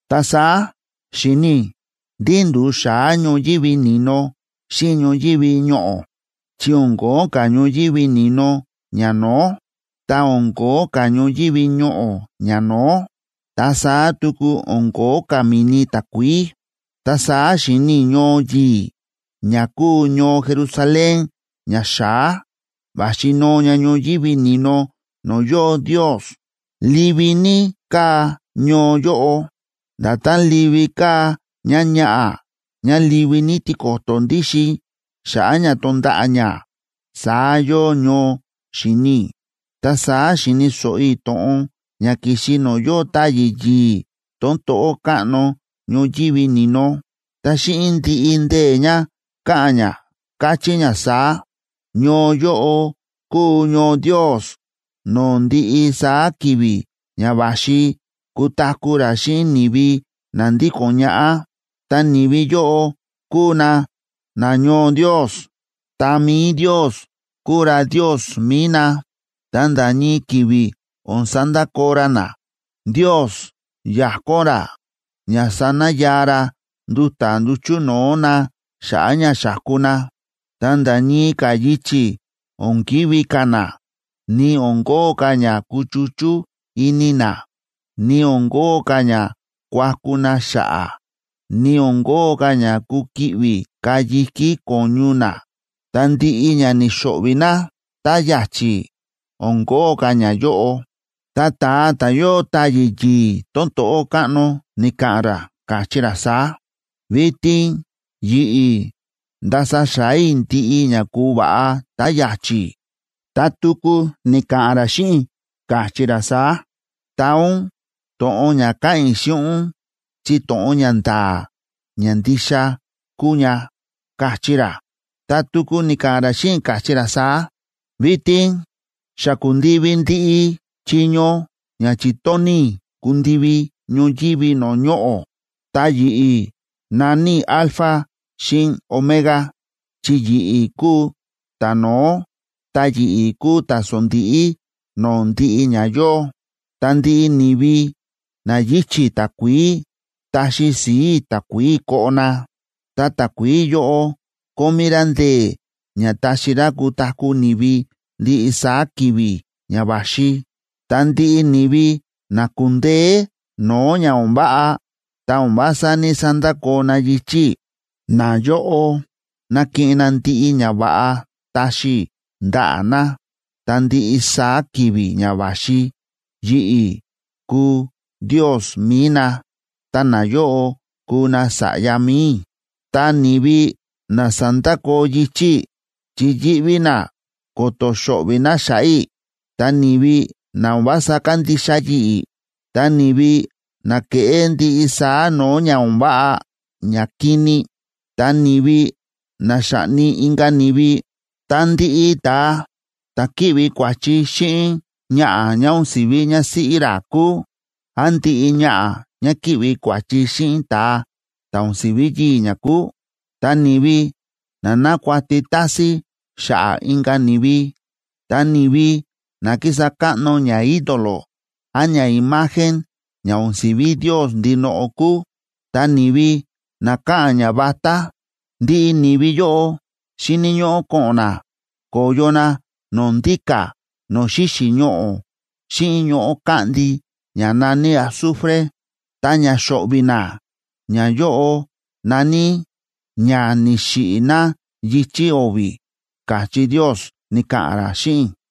Ta saá xi̱ni i̱ ndí ndu̱u xa̱á ñoyívi ni̱no xíꞌin ñoyívi ñoꞌo̱, chi o̱n ko̱ó ka̱ ñoyívi ni̱no ñano̱ó, ta o̱n ko̱ó ka̱ ñoyívi ñoꞌo̱ ñano̱ó, ta saá tuku o̱n ko̱ó ka̱ mi̱ni takuií. Ta saá xi̱ni i̱ ñoo yi̱i̱ ña kúu ñoo Jerusalén ña xa̱á, va̱xi noo ña ñoyívi ni̱no no̱o̱ yóo Ndios. Livi ní káa ñoo yóꞌo, nda̱tán livi káa ñáñaꞌa̱ ñá livi ní tiko̱to̱ ndíxin xa̱ꞌa̱ ña tonda̱ꞌa̱ ñá, saá yóo ñoo, xi̱ni i̱. Ta saá xi̱ni̱ so̱ꞌo i̱ to̱ꞌon ña ki̱xi no̱o̱ yóo táyi̱ yi̱i̱ tón to̱ꞌó káꞌno ñoyívi ni̱no, ta xíꞌin ndiꞌi ndee̱ ña káꞌa̱n ña, káchí ña saá: ―Ñoo yóꞌo kúu ñoo Ndios no̱o̱ ndiꞌi saá ki̱vi̱ ña va̱xi kutaku̱ ra xíꞌin ni̱vi na ndíko̱n ñaꞌá, ta ni̱vi yóꞌo kuu na nañoo Ndios. Ta mi̱i Ndios kuu ra Ndios mi̱i na, ta nda̱ ñii ki̱vi̱ o̱n sandakoo ra na. Ndios yakón ra ña sanayaa ra nduta̱ nduchu̱ no̱o̱ na xa̱ꞌa̱ ña xa̱ku na. Ta nda̱ ñii ka̱ yichi̱ o̱n kivi̱ ka̱ na, ni o̱n kóo ka̱ ña kuchuchú ini na, ni o̱n kóo ka̱ ña kuaku na xa̱ꞌa̱, ni o̱n kóo ka̱ ña kuki̱ꞌvi̱ ka̱ yi̱kí ko̱ñu na, ta ndiꞌi ña ni̱xo̱ꞌvi̱ na tá ya̱chi̱ o̱n kóo ka̱ ñayóꞌo. Ta ta̱a ta̱ yóo táyi̱ yi̱i̱ tón to̱ꞌó káꞌno ni̱ka̱ꞌa̱n ra, káchí ra saá: ―Vitin yi̱ꞌi̱ ndása xa̱á i̱ ndiꞌi ña ku̱va̱ꞌa tá ya̱chi̱. Ta tuku ni̱ka̱ꞌa̱n ra xíꞌin i̱, káchí ra saá: ―Taa ún to̱ꞌon ña káꞌa̱n i̱ xíꞌin ún chi to̱ꞌon ña nda̱a̱ ña ndixa kúu ña ―káchí ra. Ta tuku ni̱ka̱ꞌa̱n ra xíꞌin i̱, káchí ra saá: ―Vitin xa ku̱ndivi ndiꞌi chiño ña chi̱tóni̱ i̱ kundivi ñoyívi no̱o̱ ñoꞌo̱. Ta yi̱ꞌi̱, na̱ní i̱ “Alfa xíꞌin Omega”a chi yi̱ꞌi̱ kúu ta̱no̱ó, ta yi̱ꞌi̱ kúu ta̱sondíꞌí no̱o̱ ndiꞌi ña yóo. Ta ndiꞌi ni̱vi na yíchi̱ takuií, taxi si̱i̱ i̱ takuií koꞌo na. Ta takuií yóꞌo kómí rá ndee̱ ña taxi rá kutaku̱ ni̱vi ndiꞌi saá ki̱vi̱ ña va̱xi. Ta ndiꞌi ni̱vi na ku̱ndeé no̱o̱ ña o̱n váꞌa ta o̱n vása ní‑sandakoo na yichi̱ i̱, nayóꞌo nakiꞌin na ndiꞌi ñava̱ꞌa taxi i̱ ndaꞌa̱ na. Ta ndiꞌi saá ki̱vi̱ ña va̱xi yi̱ꞌi̱ kuu Ndios mi̱i na, ta nayóꞌo kuu nasa̱ꞌya mi̱i i̱. Ta ni̱vi na sa̱ndakoo yichi̱ i̱ chi yíꞌví na ko̱to̱ xo̱ꞌvi̱ na xa̱ꞌa̱ i̱, ta ni̱vi na o̱n vása kándixa yi̱ꞌi̱, ta ni̱vi na kéꞌé ndiꞌi saá no̱o̱ ña o̱n váꞌa ñakini, ta ni̱vi na xáꞌni inka̱ ni̱vi, ta ndiꞌi ta̱a ta̱ kíꞌvi kua̱chi xíꞌin ñaꞌa̱ ñá o̱n si̱ví ñásíꞌí ra kúu, án ndiꞌi ñaꞌa̱ ñá kíꞌvi kua̱chi xíꞌin ta̱a ta̱ o̱n si̱ví yii̱ ñá kúu, ta ni̱vi na nákuati tásín xa̱ꞌa̱ inka̱ ni̱vi, ta ni̱vi na kísa káꞌno ñaídolo án ñaimagen ña o̱n si̱ví Ndios ndinoꞌo kúu, ta ni̱vi na káꞌa̱n ñavatá, ndiꞌi ni̱vi yóꞌo xíni̱ ñóꞌó ko̱ꞌo̱n na ko̱yo na no̱o̱ ndíka̱ no̱o̱ xíxi̱ ñoꞌo̱ xíꞌin ñoꞌo̱ káꞌndi ña na̱ní azufre. Ta ña xo̱ꞌvi̱ na ñayóꞌo na̱ní “ña ni̱xiꞌi̱ na yichi̱ o̱vi̱” ―káchí Ndios, ni̱ka̱ꞌa̱n ra xíꞌin i̱.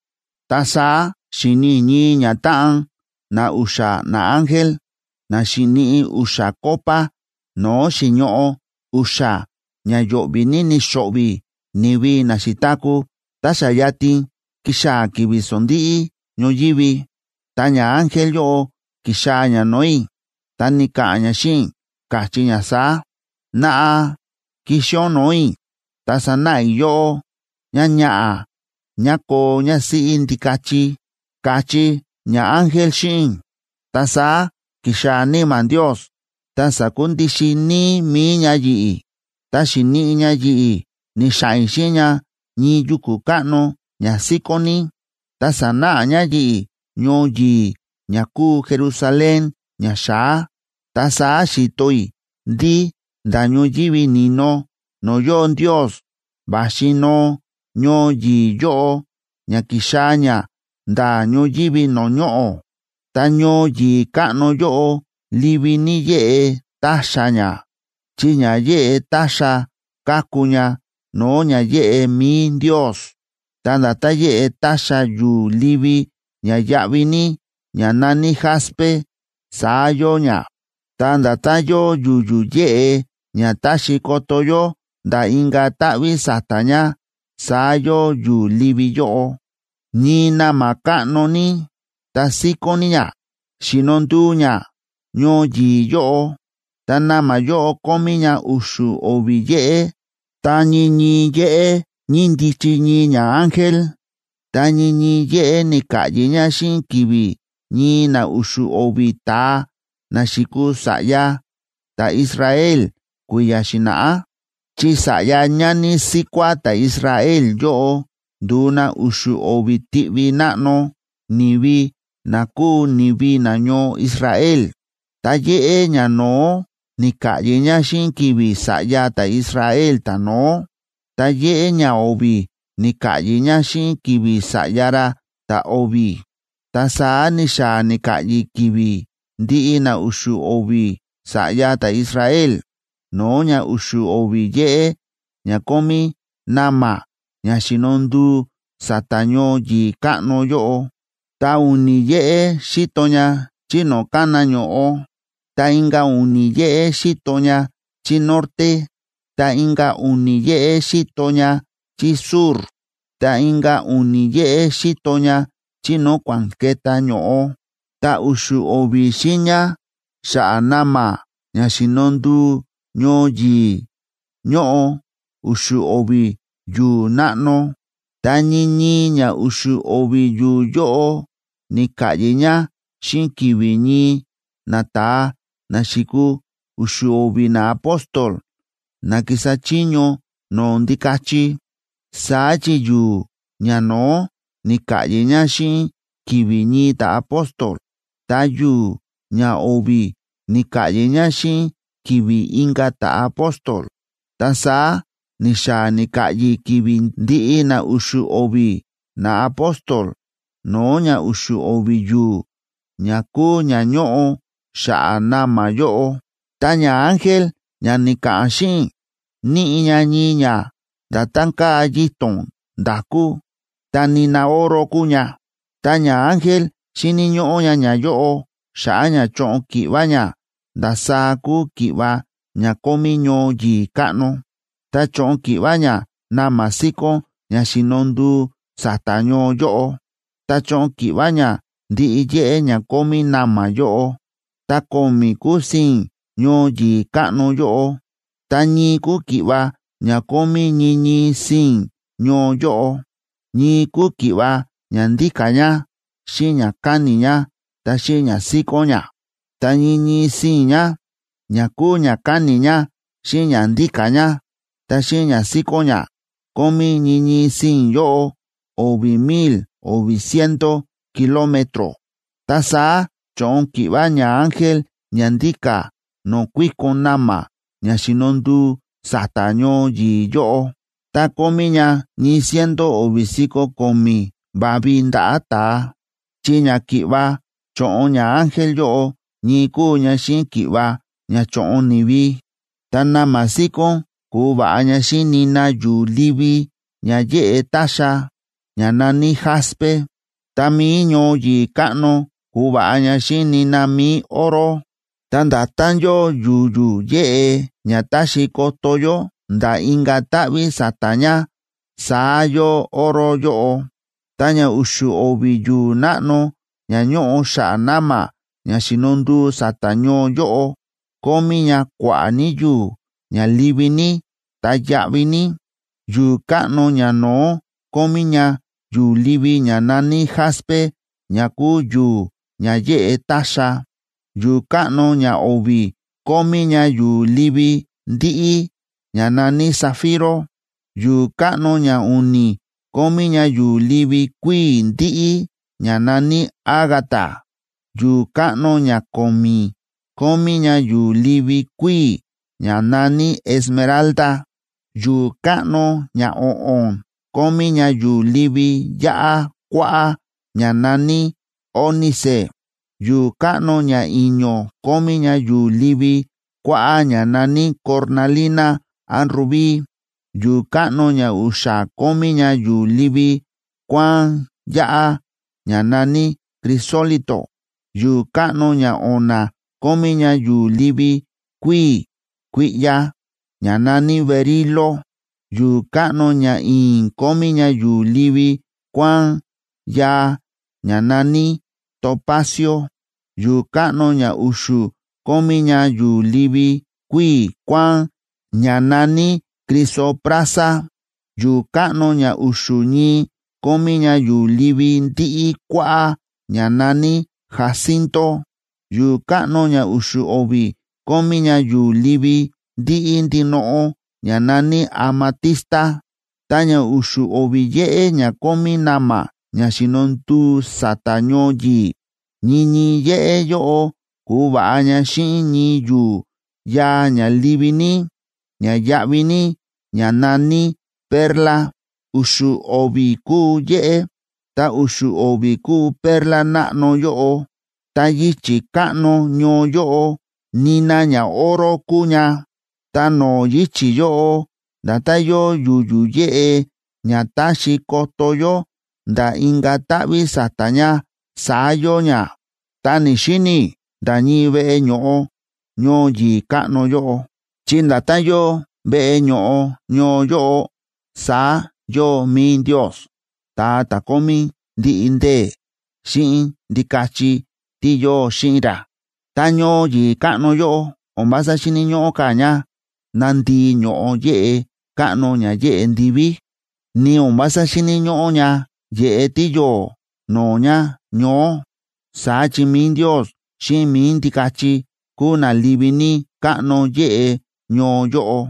Ta saá xi̱ni i̱ ñii ñatáꞌan na u̱xa̱ naángel na xi̱niꞌi u̱xa̱ copa no̱o̱ xi̱ñoꞌo u̱xa̱ ña yo̱ꞌvi̱ ní ni̱xo̱ꞌvi̱ ni̱vi na xi̱taku̱ tá xa yatin ki̱xaa̱ ki̱vi̱ sondíꞌí ñoyívi. Ta ñaángel yóꞌo ki̱xaa̱ ña no̱o̱ i̱, ta ni̱ka̱ꞌa̱n ña xíꞌin i̱, káchí ña saá: ―Naꞌa, kixi ún no̱o̱ i̱, ta sanáꞌa i̱ yóꞌó ñáñaꞌa̱ ñá koo ñásíꞌí Ndikachi ―káchí ñaángel xíꞌin i̱. Ta saá ki̱xaa̱ Níma̱ Ndios ta sa̱kundixin níí mi̱i ña yi̱ꞌi̱, ta xi̱niꞌi ña yi̱ꞌi̱ ni̱xa̱ꞌa̱n i̱ xíꞌin ña ñii yuku̱ káꞌno ña síkón ní. Ta sa̱náꞌa ña yi̱ꞌi̱ ñoo yi̱i̱ ña kúu Jerusalén ña xa̱á. Ta saá xi̱to i̱ ndí nda̱ ñoyívi ni̱no no̱o̱ yóo Ndios va̱xi noo ñoo yi̱i̱ yóꞌo ña kixaa̱ ña nda̱ ñoyívi no̱o̱ ñoꞌo̱. Ta ñoo yi̱i̱ káꞌno yóꞌo livi ní yéꞌe táxa ña, chi ña yéꞌe táxa káku ña no̱o̱ ña yéꞌe mi̱i Ndios. Ta nda̱tán yéꞌe táxa yu̱u̱ livi ña yáꞌví ní, ña na̱ní jaspe, saá yóo ña. Ta nda̱tán yóo yu̱yu̱ yéꞌe ña táxi koto yó nda̱ inka̱ táꞌví sa̱ta̱ ña, saá yóo yu̱u̱ livi yóꞌo. Ñii na̱ma̱ káꞌno ní ta síkón ní ña, xíno nduu ña ñoo yi̱i̱ yóꞌo. Ta na̱ma̱ yóꞌo kómí ña u̱xu̱ o̱vi̱ yéꞌé, ta ñii ñii yéꞌé ñíndichi ñii ñaángel, ta ñii ñii yéꞌé ni̱ka̱ꞌyi̱ ña xíꞌin ki̱vi̱ ñii na u̱xu̱ o̱vi̱ ta̱a na xi̱kuu sa̱ꞌya ta̱Israel kui̱ya̱ xi̱na̱ꞌá, chi sa̱ꞌya ñani síkuá ta̱Israel yóꞌo ndu̱u na u̱xu̱ o̱vi̱ tiꞌvi náꞌno ni̱vi na kúu ni̱vi nañoo Israel. Ta yéꞌé ñano̱ó ni̱ka̱ꞌyi̱ ña xíꞌin ki̱vi̱ sa̱ꞌya ta̱Israel ta̱no̱ó, ta yéꞌé ñao̱vi̱ ni̱ka̱ꞌyi̱ ña xíꞌin ki̱vi̱ sa̱ꞌya ra ta̱o̱vi̱, ta saá ni̱xaa̱ ni̱ka̱ꞌyi̱ ki̱vi̱ ndiꞌi na u̱xu̱ o̱vi̱ sa̱ꞌya ta̱Israel no̱o̱ ña u̱xu̱ o̱vi̱ yéꞌé ña kómí na̱ma̱ ña xíno nduu sa̱ta̱ ñoo yi̱i̱ káꞌno yóꞌo. Ta u̱ni̱ yéꞌé xíto ña chí no̱o̱ kána ño̱ꞌo, ta inka̱ u̱ni̱ yéꞌé xíto ña chí norte, ta inka̱ u̱ni̱ yéꞌé xíto ña chí sur, ta inka̱ u̱ni̱ yéꞌé xíto ña chí no̱o̱ kua̱ꞌa̱n ke̱tá ño̱ꞌo. Ta u̱xu̱ o̱vi̱ xiiña xa̱ꞌa̱ na̱ma̱ ña xíno nduu ñoo yi̱i̱ ñóꞌo u̱xu̱ o̱vi̱ yu̱u̱ náꞌno. Ta ñii ñii ña u̱xu̱ o̱vi̱ yu̱u̱ yóꞌo ni̱ka̱ꞌyi̱ ña xíꞌin ki̱vi̱ ñii nata̱a na xi̱kuu u̱xu̱ o̱vi̱ naapóstol na ki̱sa chiño no̱o̱ Ndikachi. Saá chi yu̱u̱ ñano̱ó ni̱ka̱ꞌyi̱ ña xíꞌin ki̱vi̱ ñii ta̱apóstol, ta yu̱u̱ ñao̱vi̱ ni̱ka̱ꞌyi̱ ña xíꞌin ki̱vi̱ inka̱ ta̱apóstol, ta saá ni̱xaa̱ ni̱ka̱ꞌyi̱ ki̱vi̱ ndiꞌi na u̱xu̱ o̱vi̱ naapóstol no̱o̱ ña u̱xu̱ o̱vi̱ yu̱u̱ ña kúu ña ñóꞌo xa̱ꞌa̱ na̱ma̱ yóꞌo. Ta ñaángel ña ni̱ka̱ꞌa̱n xíꞌin i̱ níꞌi ña ñii ña nda̱tán káa yito̱n nda̱kú, ta nina oro kúu ña. Ta ñaángel xi̱ni̱ ñóꞌó ña ñayóꞌo xa̱ꞌa̱ ña choꞌon ki̱ꞌva ña ndasaá kúu ki̱ꞌva ña kómí ñoo yi̱i̱ káꞌno. Ta cho̱ꞌon ki̱ꞌva ña na̱ma̱ síkón ña xíno nduu sa̱ta̱ ñoo yóꞌo, ta cho̱ꞌon ki̱ꞌva ña ndiꞌi yéꞌé ña kómí na̱ma̱ yóꞌo. Ta ko̱mi̱ kúu sii̱n ñoo yi̱i̱ káꞌno yóꞌo, ta ñii kúu ki̱ꞌva ña kómí ñii ñii sii̱n ñoo yóꞌo. Ñii kúu ki̱ꞌva ña ndíka̱ ña, xíꞌin ña káni̱ ña, ta xíꞌin ña síkón ña. Ta ñii ñii sii̱n ña, ña kúu ña káni̱ ña xíꞌin ña ndíka̱ ña, ta xíꞌin ña síkón ña, kómí ñii ñii sii̱n yóꞌo o̱vi̱ mil o̱vi̱ ciento kilómetro.b Ta saá cho̱ꞌon ki̱ꞌva ñaángel ña ndíka̱ no̱o̱ kuíkon na̱ma̱ ña xíno nduu sa̱ta̱ ñoo yi̱i̱ yóꞌo, ta kómí ña ñii ciento o̱vi̱ si̱ko̱ ko̱mi̱ va̱vi ndaꞌa̱ ta̱a. Chi ña ki̱ꞌva cho̱ꞌon ñaángel yóꞌo ñii kúu ña xíꞌin ki̱ꞌva ña chóꞌon ni̱vi. Ta na̱ma̱ síkón ku̱va̱ꞌa ña xíꞌin nina yu̱u̱ livi ña yéꞌe táxa, ña na̱ní jaspe. Ta mi̱i ñoo yi̱i̱ káꞌno ku̱va̱ꞌa ña xíꞌin nina mi̱i oro. Ta nda̱tán yóo yu̱yu̱ yéꞌe ña táxi koto yó nda̱ inka̱ táꞌví sa̱ta̱ ña, saá yóo oro yóꞌo. Ta ña u̱xu̱ o̱vi̱ yu̱u̱ náꞌno ña ñóꞌo xa̱ꞌa̱ na̱ma̱ ña xíno nduu sa̱ta̱ ñoo yóꞌo, kómí ña kua̱ꞌa̱ ní yu̱u̱ ña livi ní, ta yáꞌví ní. Yu̱u̱ káꞌno ñano̱ó kómí ña yu̱u̱ livi ña na̱ní jaspe ña kúu yu̱u̱ ña yéꞌe táxa. Yu̱u̱ káꞌno ñao̱vi̱ kómí ña yu̱u̱ livi ndíꞌí, ña na̱ní zafiro. Yu̱u̱ káꞌno ñau̱ni̱ kómí ña yu̱u̱ livi kuíi̱ ndíꞌí, ña na̱ní ágata. Yu̱u̱ káꞌno ñako̱mi̱ kómí ña yu̱u̱ livi kuíi̱, ña na̱ní esmeralda. Yu̱u̱ káꞌno ñao̱ꞌo̱n kómí ña yu̱u̱ livi yáꞌá kuáꞌá ña na̱ní ónice. Yu̱u̱ káꞌno ñai̱ño̱ kómí ña yu̱u̱ livi kuáꞌá ña na̱ní cornalina án rubí. Yu̱u̱ káꞌno ñau̱xa̱ kómí ña yu̱u̱ livi kuáán yáꞌá ña na̱ní crisólito. Yu̱u̱ káꞌno ñao̱na̱ kómí ña yu̱u̱ livi kuíi̱ kuiꞌya, ña na̱ní berilo. Yu̱u̱ káꞌno ñai̱i̱n kómí ña yu̱u̱ livi kuáán yaa ña na̱ní topacio. Yu̱u̱ káꞌno ñau̱xu̱ kómí ña yu̱u̱ livi kuíi̱ kuáán ña na̱ní crisoprasa. Yu̱u̱ káꞌno ña u̱xu̱ ñii kómí ña yu̱u̱ livi ndíꞌí kuáꞌá, ña na̱ní jacinto. Yu̱u̱ káꞌno ña u̱xu̱ o̱vi̱ kómí ña yu̱u̱ livi ndíꞌí ndinoꞌo, ña na̱ní amatista. Ta ña u̱xu̱ o̱vi̱ yéꞌé ña kómí na̱ma̱ ña xíno nduu sa̱ta̱ ñoo yi̱i̱, ñii ñii yéꞌé yóꞌo ku̱va̱ꞌa ña xíꞌin ñii yu̱u̱ yaa ña livi ní, ña yáꞌví ní, ña na̱ní perla. U̱xu̱ o̱vi̱ kúu yéꞌé, ta u̱xu̱ o̱vi̱ kúu perla náꞌno yóꞌo. Ta yichi̱ káꞌno ñoo yóꞌo, nina ñaoro kúu ña. Ta no̱o̱ yichi̱ yóꞌo, nda̱tán yóo yu̱yu̱ yéꞌe ña táxi koto yó nda̱ inka̱ táꞌví sa̱ta̱ ña, saá yóo ña. Ta ni̱‑xini i̱ nda̱ ñii veꞌe ño̱ꞌo ñoo yi̱i̱ káꞌno yóꞌo, chi nda̱tán yóo veꞌe ño̱ꞌo ñoo yóꞌo, saá yóo mi̱i Ndios, ta̱a ta̱ kómí ndiꞌi ndee̱, xíꞌin Ndikachi tí yóo xíꞌin ra. Ta ñoo yi̱i̱ káꞌno yóꞌo o̱n vása xíni̱ ñóꞌó ka̱ ña nandíi̱ ño̱ꞌo yéꞌe káꞌno ña yeꞌe ndiví, ni o̱n vása xíni̱ ñóꞌó ña yeꞌe tíyo̱o̱ no̱o̱ ña ñoó, saá chi mi̱i Ndios xíꞌin mi̱i Ndikachi kúu na livi ní káꞌno yéꞌe ñoo yóꞌo.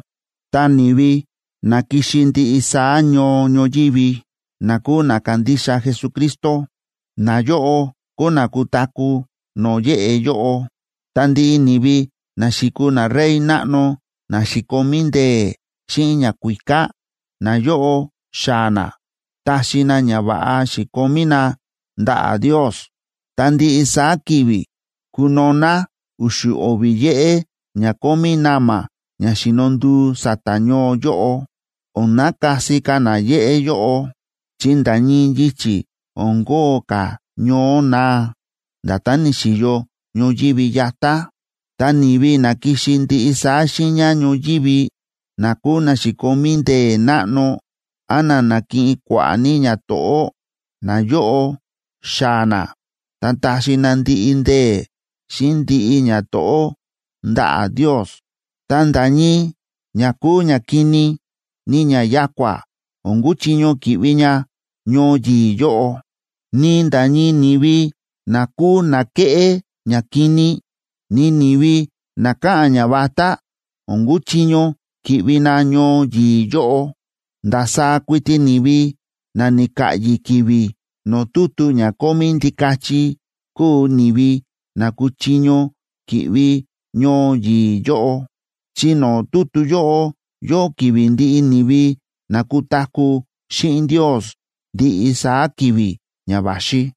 Ta ni̱vi na ki̱xi ndiꞌi saá ñoo ñoyívi na kúu na kándixa Jesucristo, nayóꞌo kuu na kutaku̱ no̱o̱ yéꞌe yóꞌo. Ta ndiꞌi ni̱vi na xi̱kuu narey náꞌno na xi̱komí ndee̱ xíꞌin ñakuíká, nayóꞌo xaa̱ na taxi na ñava̱ꞌa xi̱komí na ndaꞌa̱ Ndios. Ta ndiꞌi saá ki̱vi̱ kuno̱ná u̱xu̱ o̱vi̱ yéꞌé ña kómí na̱ma̱ ña xíno nduu sa̱ta̱ ñoo yóꞌo. O̱n nakasi ka̱ na yéꞌé yóꞌo, chi nda̱ ñii yichi̱ o̱n kóo ka̱ ñoó naa, nda̱tán ni̱xi̱yo ñoyívi yatá. Ta ni̱vi na ki̱xi ndiꞌi saá xiiña ñoyívi, na kúu na xi̱komí ndee̱ náꞌno án na na̱kiꞌin kua̱ꞌa̱ ní ñato̱ꞌó, nayóꞌo xaa̱ na ta taxi na ndiꞌi ndee̱ xíꞌin ndiꞌi ñato̱ꞌó ndaꞌa̱ Ndios. Ta nda̱ ñii ña kúu ñakini, ni ña ya̱kua̱ o̱n kuchiño ki̱ꞌvi ña ñoo yi̱i̱ yóꞌo. Ni nda̱ ñii ni̱vi na kúu na kéꞌé ñakini, ni ni̱vi na káꞌa̱n ñavatá, o̱n kuchiño ki̱ꞌvi na ñoo yi̱i̱ yóꞌo. Ndasaá kuiti ni̱vi na ni̱ka̱ꞌyi̱ ki̱vi̱ no̱o̱ tutu ña kómí Ndikachi kúu ni̱vi na kuchiño ki̱ꞌvi ñoo yi̱i̱ yóꞌo, chi no̱o̱ tutu yóꞌo yóo ki̱vi̱ ndiꞌi ni̱vi na kutaku̱ xíꞌin Ndios ndiꞌi saá ki̱vi̱ ña va̱xi.